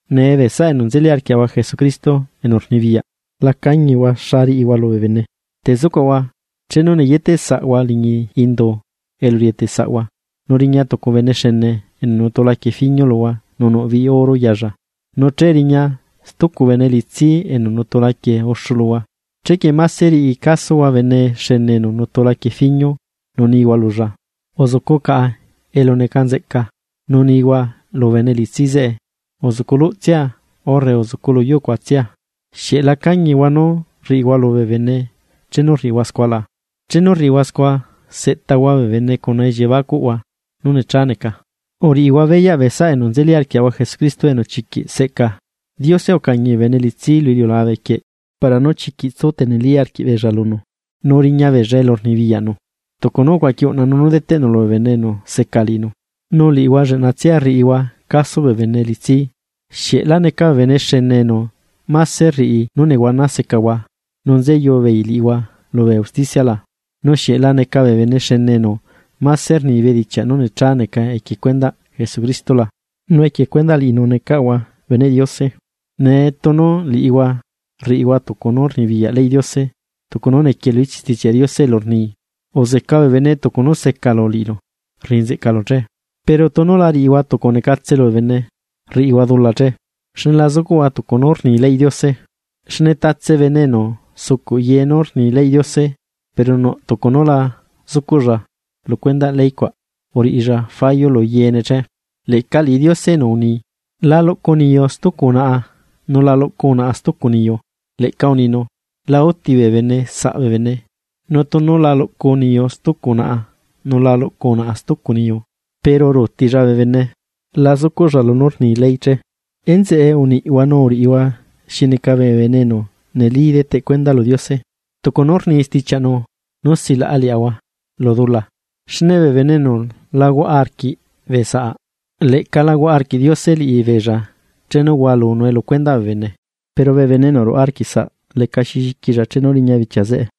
Nee, bee saꞌa enu nzeli arquiaꞌahua Jesucristo enu rnibiyaꞌ, la cañihua xa riꞌihua lubee bene. Te zucuaꞌahua, chenu neyeteꞌsaꞌhua liñi indu elu rieteꞌsaꞌhua, nu riña tucu bene xene enu nutu laquie fiñu luhua nu nuꞌ biꞌi oro yaalla, nu che riña tucu bene elitsi enu nutu laquie uxu luhua. Chequie máse riꞌi casohua bene xene enu nutu laquie fiñu nu nihua lulla: “Uzucu caꞌa elu neca nzeꞌca.” Nu nihua lu bene elitsi zeꞌe: “Uzucu luꞌtsia urre uzucu lu yuu cuaꞌ.” ¿Xieꞌ la cañihua nú rriꞌihua lubee bene chenu rriꞌihua scua la? Chenu rriꞌihua scua seꞌtahua bee bene cuna elliebacuꞌhua nú necha neca. Uriꞌihua beyaꞌ bee saꞌa enu nzeli arquiaꞌahua Jesucristo enu chiquiꞌ seꞌca. Diose ucañi bee bene elitsi lu iliulabe quieꞌ para nú chiquiꞌ tsu teneli arquiꞌbeella lunu, nu riña beella elu rnibiyaꞌnu, tucu nú ucuaqui uꞌnanu nú deteꞌnu lubee bene enu seca liꞌinu. Nu liꞌihua lleꞌnatsia rriꞌihua caso bee bene elitsi. ¿Xieꞌ la neca bee bene xene enu máse rriꞌi nú nehuana secahua nu ruyaꞌ beei liꞌihua lubee usticia la? Nu ¿xieꞌ la neca bee bene xene enu máse rni bedichiaꞌ nú necha neca equie cuendaꞌ Jesucristo la?, nu equie cuendaꞌ liꞌinu necaꞌahua beneꞌ Diose. Nee quie tunu liꞌihua rriꞌihua tucu nú rnibiyaꞌ ley Diose, tucu nú niquie lu ichiꞌ stichiaꞌnu elu rni: “Uzeca bee bene tucu nú secalu liꞌilu rriꞌi nzeꞌcalu che.” Pero tunu la riꞌihua tucu necatse lubee bene, rriꞌihua dula che, xne la zucuꞌhua tucu nú rni leyꞌ Diose. Xne tatse bene enu sucuꞌ yee nú rni leyꞌ Diose, pero nuꞌ tucu nú la zucuꞌlla lu cuendaꞌ ley cuaꞌ, uriꞌilla fallo lu yeene che. Leꞌca liꞌi Diose enu uni: “La luꞌcu niyu stucu unaꞌa, nu la luꞌcu unaꞌa stucu niyu”, leꞌca uninu: “La úti bee bene saꞌ bene.” Nu tunu la luꞌcu niyu stucu unaꞌa nu la luꞌcu unaꞌa stucu niyu, pero ruutilla bee bene, scua la zucuꞌlla lunú rni ley. Enzeꞌe uniꞌhua nu uriꞌihua xi neca bee bene enu neli deteꞌ cuenda lu Diose, tucu nú rni stichiaꞌnu nú silaꞌa liaꞌahua lu dula. Xne bee bene enu la huaꞌa arquiꞌ bee saꞌ, leꞌca lahuaꞌa arquiꞌ Diose liꞌibeella chenu hualunue lu cuendaꞌ bee bene, pero bee bene enu ruaꞌa arquiꞌ saꞌ lecaxi lliquilla chenu riña bichia zeꞌe.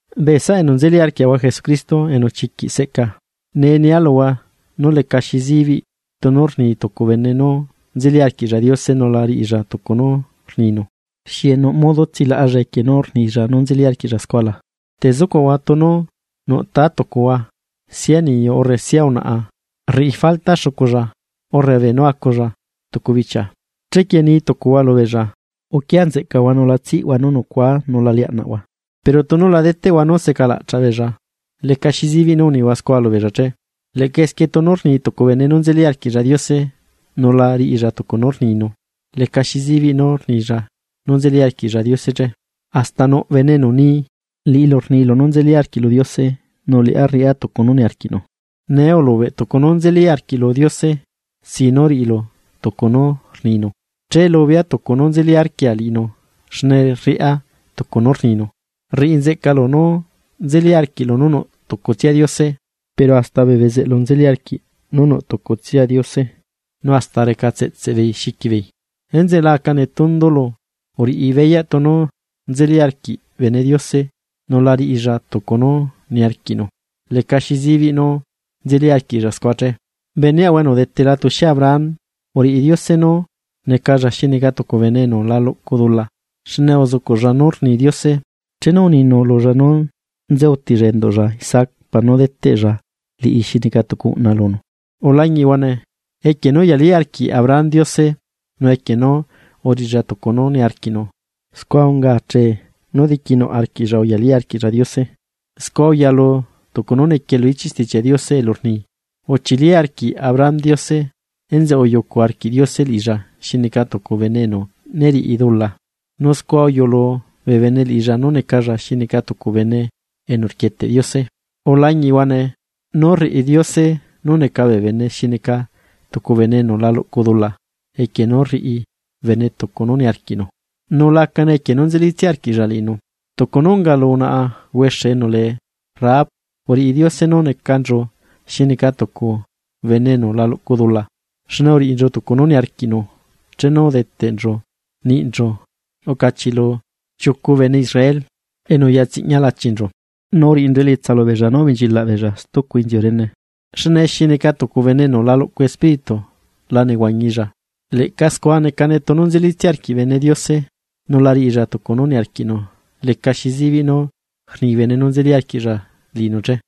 Bee saꞌa enu nzeli arquiaꞌahua Jesucristo enu chiquiꞌ seꞌca, nee nia luhua lecaxi zibiꞌ tunu rni tucu bene nú nzeli arquiꞌlla Diose nu la riꞌilla tucu nú rninu, ¿xieꞌ nuꞌ modo tsilaꞌalla equie nú rnilla nú nzeli arquiꞌlla scua la? Te zucuꞌahua tunu nuꞌ taa tucuꞌahua sia niyu urre sia unaꞌa rriꞌi falta xuculla, urre beenú aculla tucu bichia. Chequie ni tucuhua lubeella: “Uquia nzeꞌcahua nu la tsiꞌhua nú nucuaa nu la liaꞌnaꞌhua”, pero tunu la deteꞌhua nú secalaꞌchaꞌ beella; ¿lecaxi zibiꞌ nú unihua scua lubeella che? Leꞌca esquie tunu rni tucu bene nú nzeli arquiꞌlla Diose nu la riꞌilla tucu nú rninu, lecaxi zibiꞌ nú rnilla nú nzeli arquiꞌlla Diose che. Hasta nuꞌ bene enu ni: “Liꞌilu rnilu nú nzeli arquiꞌlu Diose, nu liꞌá rriꞌá tucu nu niarquiꞌnu.” Nee ulubeꞌ tucu nú nzeli arquiꞌlu Diose sin nú riꞌilu tucu nú rninu, che lubea tucu nú nzeli arquia liꞌinu xne rriꞌa tucu nú rninu. Rriꞌi nzeꞌcalu nú nzeli arquiꞌlu nú nuꞌ tucutsia Diose. Pero hasta bee bezeꞌlu nzeli arquiꞌ nú nuꞌ tucutsia Diose nu hasta recatseꞌtseꞌ beei xiqui beei. Enzeꞌe la aca netundulu, uriꞌi beyaꞌ tunu nzeli arquiꞌ bene Diose nu la riꞌilla tucu nú niarquiꞌnu, lecaxi zibiꞌ nú nzeli arquiꞌlla scua che. Beneaꞌahua enu udetela tuxie Abraham, uriꞌi Diose nú necalla xi neca tucu bene enu la luꞌcu dula, xne uzucuꞌlla nú rni Diose chenu uninu lulla nú nze utilla enduꞌlla Isaac para deteꞌlla liꞌi xi neca tucu uꞌna lunu. Ulañiꞌhua nee, equie nú uyali arquiꞌ Abraham Diose, nu equie nú uriꞌilla tucu nú niarquiꞌnu, scua unga achee nú diquinuꞌ arquiꞌlla uyalí arquiꞌlla liꞌinu. Scua uyalu tucu nú niquie lu ichiꞌ Stichiaꞌ Diose elu rni: “Uchili arquiꞌ Abraham Diose, enzeꞌe uyucu arquiꞌ Diose liꞌilla xi neca tucu bene enu né riꞌi dula.” Nu scua uyulu bee bene liꞌilla nu necalla xi neca tucu enu rquieteꞌ Diose. Ulañiꞌhua nee, nú rriꞌi Diose nú neca bee bene xi neca tucu bene enu la luꞌcu dula equie nú rriꞌi bene tucu nú niarquiꞌnu, nu lacane equie nú nzelitsia arquiꞌlla liꞌinu. Tucu nú unga lu unaꞌa huexe enu lee Rahab uriꞌi Diose nú necanchu xi neca tucu bene enu la luꞌcu dula, xne uriꞌinchu tucu nú niarquiꞌnu chenu udeteꞌnchu niꞌnchu ucachiꞌlu chiucu bene Israel enu uyatsiꞌña lachinchu, nu uriꞌinchu elietsa lubeella nú ubenchilaꞌ beella stucu inziu rene. Xne xi neca tucu bene enu la luꞌcu espíritu la nehuañilla, leꞌca scua necane tunu nzelitsia arquiꞌ bene Diose, nu la riꞌilla tucu nú niarquiꞌnu lecaxi zibiꞌ nú rni bene nú nzeli arquiꞌlla liꞌinu che.